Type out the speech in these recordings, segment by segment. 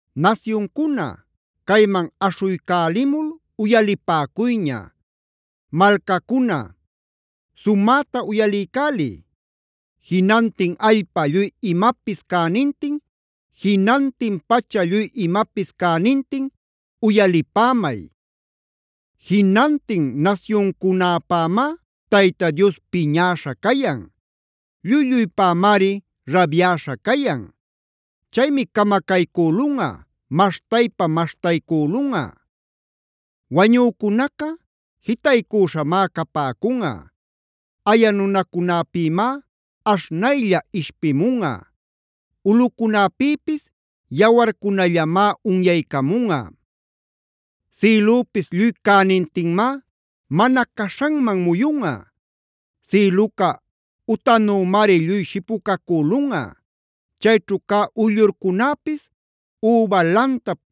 Nasyuncuna, cayman aśhuycälimul uyalipäcuyña; malcacuna sumäta uyaliycäliy. Jinantin allpa lluy imapis cänintin, jinantin pacha lluy imapis cänintin uyalipämay. Jinantin nasyuncunäpämá Tayta Dios piñäśha cayan; lluy-lluypämari rabyäśha cayan. Chaymi camacaycülunꞌa, maśhtaypa-maśhtaycülunꞌa. Wañücunaca jitaycüśhamá capäcunꞌa; aya nunacunäpïmá aśhnaylla ishpimunꞌa; ulꞌucunäpïpis yawarcunallamá unyaycamunꞌa. Sïlüpis lluy cänintinmá mana caśhanman muyunꞌa; sïluca utanümari lluy shipucacülunꞌa. Chayćhu cä uyllurcunäpis üba lantap,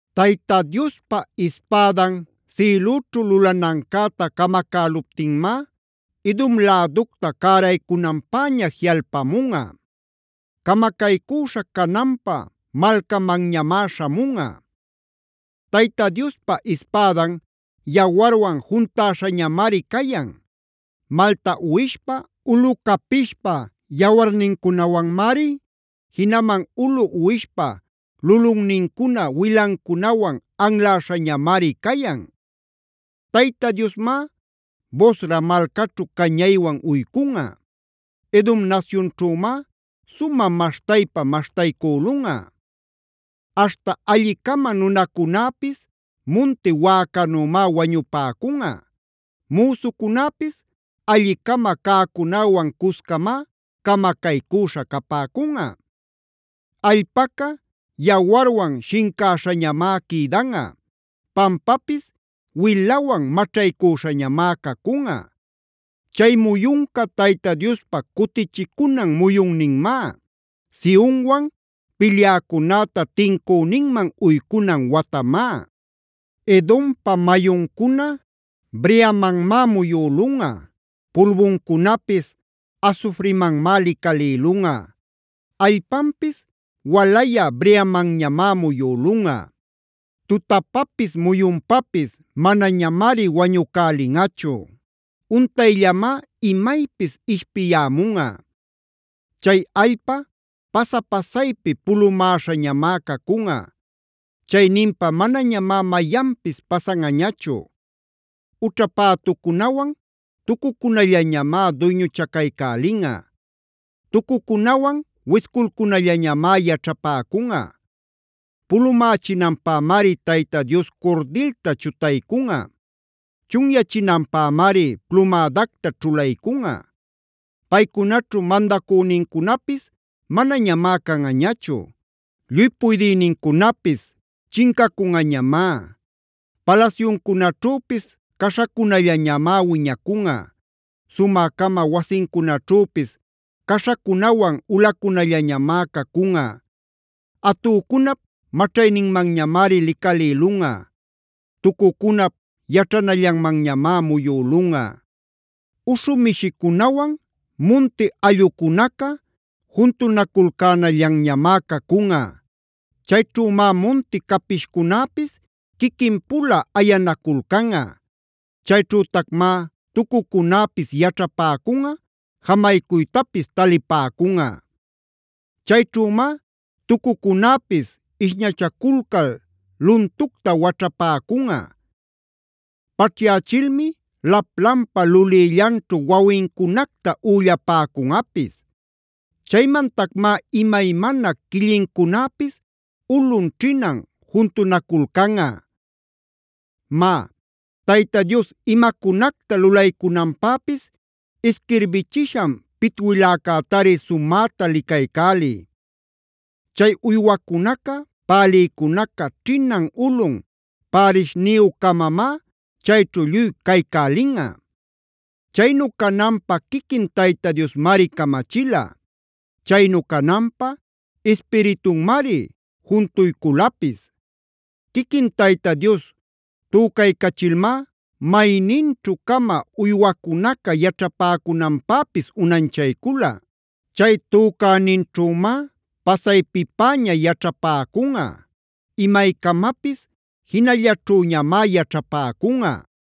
Tayta Diospa ispädan sïlüćhu lulanancäta camacäluptinmá, Edom läducta cäraycunanpäña jiꞌalpamunꞌa; camacaycüśha cananpä malcamanñamá śhamunꞌa. Tayta Diospa ispädan yawarwan juntäśhañamari cayan. Malta uwishpa, ulu capishpa yawarnincunawanmari, jinaman ulu uwishpa lulunnincuna wilancunawan anläśhañamari cayan. Tayta Diosmá Bosra malcaćhu cañaywan uycunꞌa; Edom nasyunćhümá sumä maśhtaypa-maśhtaycülunꞌa. Aśhta alli-cama nunacunäpis munti wäcanümá wañupäcunꞌa; müsucunäpis alli-cama cäcunäwan cuscamá camacaycüśha capäcunꞌa. Allpaca yawarwan shincäśhañamá quïdanꞌa; pampapis wilawan maćhaycüśhañamá cacunꞌa. Chay muyunca Tayta Diospa cutichicunan muyunninmá, Sionwan pilyäcunäta tincüninman uycunan watamá. Edompa mayuncuna breamanmá muyülunꞌa; pulbuncunapis asufrimanmá licalïlunꞌa; allpanpis walayä breamanñamá muyülunꞌa. Tutapapis muyunpapis manañamari wañucälinꞌachu; untayllamá imaypis ishpiyämunꞌa.b Chay allpa pasa-pasaypi pulumäśhañamá cacunꞌa; chayninpa manañamá mayanpis pasanꞌañachu. Ućha pätucunawan tucucunallañamá duyñuchacaycälinꞌa; tucucunawan wisculcunallañamá yaćhapäcunꞌa. Pulumächinanpämari Tayta Dios curdilta chutaycunꞌa; chunyachinanpämari plumädacta ćhulaycunꞌa. Paycunaćhu mandacünincunapis manañamá canꞌañachu; lluy puydïnincunapis chincacunꞌañamá. Palasyuncunaćhüpis caśhacunallañamá wiñacunꞌa; sumä-cama wasincunaćhüpis caśhacunawan ulacunallañamá cacunꞌa. Atücunap maćhayninmanñamari licalïlunꞌa; tucucucunap yaćhanallanmanñamá muyülunꞌa. Uśhu mishicunawan munti allꞌucunaca juntunaculcänallanñamá cacunꞌa. Chayćhümá munti capishcunäpis quiquinpula ayanaculcanꞌa. Chayćhütacmá tucucunäpis yaćhapäcunꞌa, jamaycuytapis talipäcunꞌa. Chayćhümá tucucunäpis ishñachaculcal luntucta waćhapäcunꞌa. Paćhyächilmi laplanpa lulïllanćhu wawincunacta üllapäcunꞌapis. Chaymantacmá imaymana quillincunäpis ulun-ćhinan juntunaculcanꞌa. Má, Tayta Dios imacunacta lulaycunanpäpis isquirbichishan pitwiläcätari sumäta licaycäliy. Chay uywacunaca, pälïcunaca ćhinan-ulun pärishniyu-camamá chayćhu lluy caycälinꞌa. Chaynu cananpä quiquin Tayta Diosmari camachila; chaynu cananpa Ispiritunmari juntuyculapis. Quiquin Tayta Dios tücaycachilmá mayninćhu-cama uywacunaca yaćhapäcunanpäpis unanchaycula. Chay tücäninćhümá pasaypipäña yaćhapäcunꞌa; imaycamapis jinallaćhüñamá yaćhapäcunꞌa.